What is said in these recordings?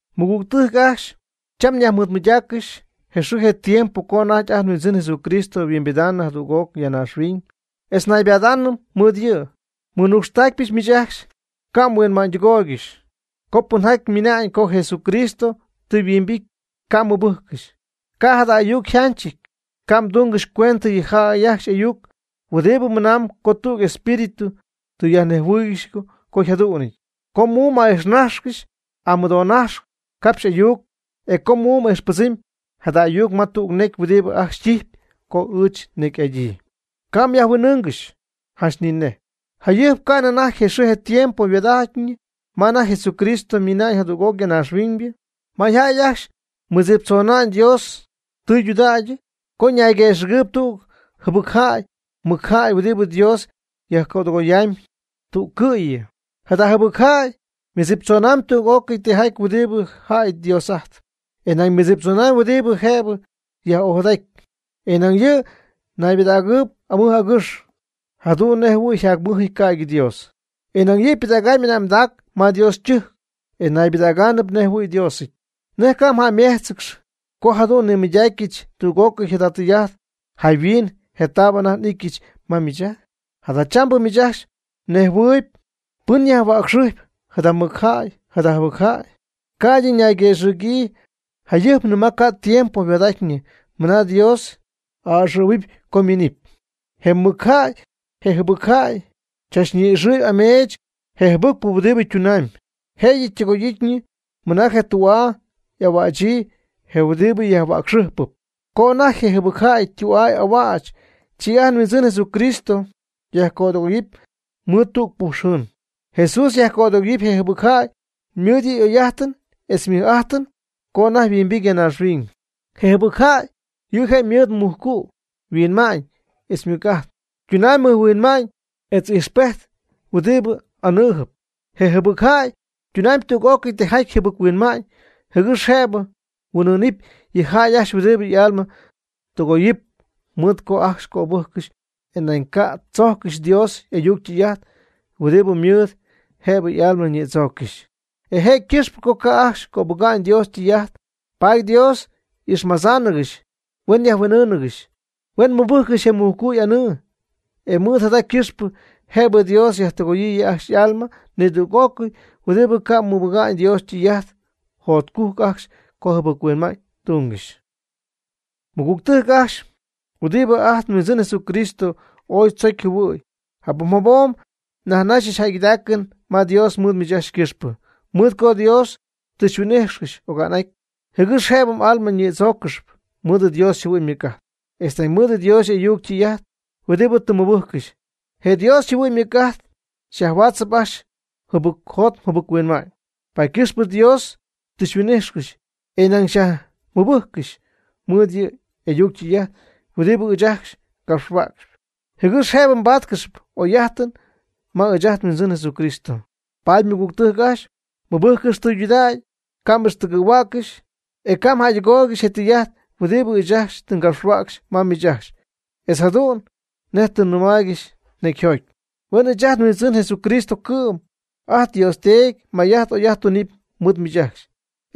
Mɨgügtɨjc ajcxy, cham nyajmɨɨdmɨydaaccɨxy je xɨɨ je tiempo co anajty ajt nHuindzɨn Jesucristo huimbidaanɨ jadüg'oc ya naaxhuiñ, etz naybadaanɨm mɨɨd yɨ'. Nmɨnucxtaacpyɨch miich ajcxy, ca' mhuinma'ñytɨgooygɨxy co pɨnjaty ymɨna'ñ co Jesucristo tɨ yhuimbity. Ca' mmɨbɨjccɨxy, ca' jada ayuc yjanchɨty. Ca' mdungɨxy cuendɨ yɨ jäy ajcxy y'ayuc huɨdibɨ mɨnamb co tüg espíritu tɨ yajnejhuɨɨygɨxy co yjadu'nɨty, o co muum a'ijxnaxy amɨdoonaxy capxy ayuc, o co muum ijxpɨdzɨmy jada ayuc ma tüg necy huɨdibɨ ajcxy ytijpy co ɨɨch nnecy'adyii. Ca' myajhuin'ɨɨngɨx janch ni nej. Jayɨjp ca'nɨ anajty je xɨɨ je tiempo yhuaad'atyñɨ ma anajty Jesucristo ymiina'ñ jadüg'oc ya naaxhuiñ, mayjäy ajcxy mɨdziptzona'ñ Dios tɨydudägy co ñayguëxɨ̈gɨɨyb tüg jɨbɨc jäy mɨc jäy huɨdibɨ Dios yajcödɨgoyamy tüccɨ'yɨ. Jada jɨbɨc jäy ymɨdziptzonamyb tüg'ócɨy tijaty huɨdibɨ jäy Dios'ajtpy, e nañ ymɨdziptzonamyb huɨdibɨ jëbɨ yaj'ojadaty. E nañ yɨ' naybɨdägɨɨb amɨj agɨx jadu'n nejhuɨ̈y yjacmɨjɨty ca'ydɨ Dios. E nañ yɨ' ypɨdägamb y'ane'mdac ma Dios ytɨjc, e naybɨdägaanɨp nejhuɨ̈y Diosɨty. ¿Nej ca' mjäymejtzcɨxy co jadu'n nimɨydacyɨch tüg'ócɨy jada tɨy'ajt jayhuin je taab anajty n'ityɨch ma miich ajcxy? Jadachambɨ miich ajcxy mnejhuɨɨyb pɨn yajhuäcxɨjp jada mɨc jäy jada jɨbɨc jäy, jɨgɨx ca'ydɨ ñayguëxɨ̈gyii jayɨjpnɨ ma ca'nɨ tiempo yhuaad'atyñɨ mɨna Dios a'ɨxɨ̈huɨp co ymiinɨpy. Je mɨc jäy je jɨbɨc jäy cham ñi'ixɨɨyb ameech je jɨbɨcpɨ huɨdibɨ ytunamyb, jëyɨ ytɨgoy'ityñɨ mɨna je tü'aa y'ahuächyii, je huɨdibɨ yajhuäcxɨjpɨp. Co anajty je jɨbɨc jäy ytü'aa y'ahuäch, chi ajt nHuindzɨn Jesús yajcödɨgoyɨpy mɨɨd tüg puxujɨn. Jesús yajcödɨgoyɨpy je jɨbɨc jäy mɨɨd yɨ' y'oy'ajtɨn etz ymɨj'ajtɨn co anajty yhuimbity ya naaxhuiñ. Je jɨbɨc jäy, yɨ' je' ymɨɨd je mujcu' yhuinma'ñ etz ymɨc'ajt, e ytunamyb mɨjhuinma'ñ etz ijxpejt huɨdibɨ anɨɨjɨp. Je jɨbɨc jäy ytunamyb tüg'ócɨy tijaty jɨbɨc-huinma'ñ jɨgɨx jëbɨ huin'ɨɨnɨp yɨ jäy ajcxy huɨdibɨ y'alma tɨgoyɨpy, mɨɨd co ca' ajcxy cöbɨjccɨxy, e nañ ca' tzojccɨxy Dios y'ayuc ytɨy'ajt huɨdi mɨɨd jëbɨ y'alma ñïdzooccɨxy. E je' ycɨxpɨ co ca' ajcxy cöbɨga'ñ Dios ytɨy'ajt, paady Dios y'ixmadzáanɨgɨxy huen yajhuin'ɨɨngɨxy, huen mɨbɨjccɨxy je mujcu' y'anɨɨ, e mɨɨd jada ycɨxpɨ jëbɨ Dios yajtɨgooyɨ yɨ' ajcxy y'alma nidüg'ócɨy huɨdibɨ ca' mɨbɨga'ñ Dios ytɨy'ajt. Jacjotcujc ajcxy co jɨbɨc-huinma'ñ tungɨxy. Mɨgügtɨjc ajcxy huɨdibɨ ajt nHuindzɨn Jesucristo ooy tzocy jɨhuɨ̈y, jabom jabom nyajnaxyɨch jäygɨdaacɨn ma Dios mɨɨd miich ajcxy ycɨxpɨ, mɨɨd co Dios tɨ xyhuin'ijxcɨxy oga'n'aty, jɨgɨx jëbɨ m'alma ñïdzooccɨxy mɨɨd Dios yjɨhuɨ'ñ ymɨc'ajt, etz nañ mɨɨd Dios y'ayuc ytɨy'ajt huɨdibɨ tɨ mmɨbɨjccɨxy. Je Dios yjɨhuɨ'ñ ymɨc'ajt xyajhuaatzɨp ajcxy mjɨbɨcjot mjɨbɨc-huinma'ñ. Paady ycɨxpɨ Dios tɨ xyhuin'ijxcɨxy, e nañ xyajmɨbɨjccɨxy mɨɨd yɨ' y'ayuc ytɨy'ajt huɨdibɨ ɨɨch ajcxy ngapxhuäcxyp, jɨgɨx jëbɨ mbáatcɨxɨpy oy'ajtɨn ma ɨɨch ajt nHuindzɨn Jesucristo. Paady mɨgügtɨjc ajcxy, mɨbɨjccɨx tɨydudägy, ca' m'ixtɨgɨ̈huäccɨxy, e ca' mjäydɨgooygɨxy je tɨy'ajt huɨdibɨ ɨɨch ajcxy tɨ ngapxhuäcxy ma miich ajcxy, etz jadu'n nej tɨ nnɨmaaygɨxy necyjoty. Huen ɨɨch ajt nHuindzɨn Jesucristo cɨ'm etz ajt nDios Teedy may'ajt oy'ajt tunɨpy mɨɨd miich ajcxy,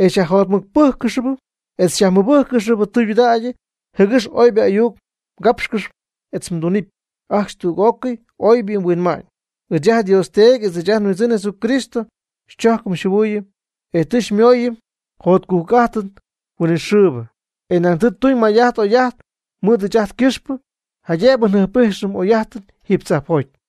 e xyajjotmɨcpɨ́jccɨxɨpy etz xyajmɨbɨ́jccɨxɨpy tɨydudägy, jɨgɨx oybɨ ayuc mgápxcɨxɨpy etz mdunɨpy ajcxy tüg'ócɨy oybɨ huinma'ñ. Ɨɨch ajt nDios Teedy etz ɨɨch ajt nHuindzɨn Jesucristo xychojcɨm xyjɨhuɨɨyɨm, e tɨ xymooyɨm jotcujc'ajtɨn huinɨxɨɨbɨ, e nañ tɨ tuñ may'ajt oy'ajt mɨɨd ɨɨch ajt ycɨxpɨ, jaydëbɨ njɨjp'ijxɨm oy'ajtɨn jiiby tzajpjoty.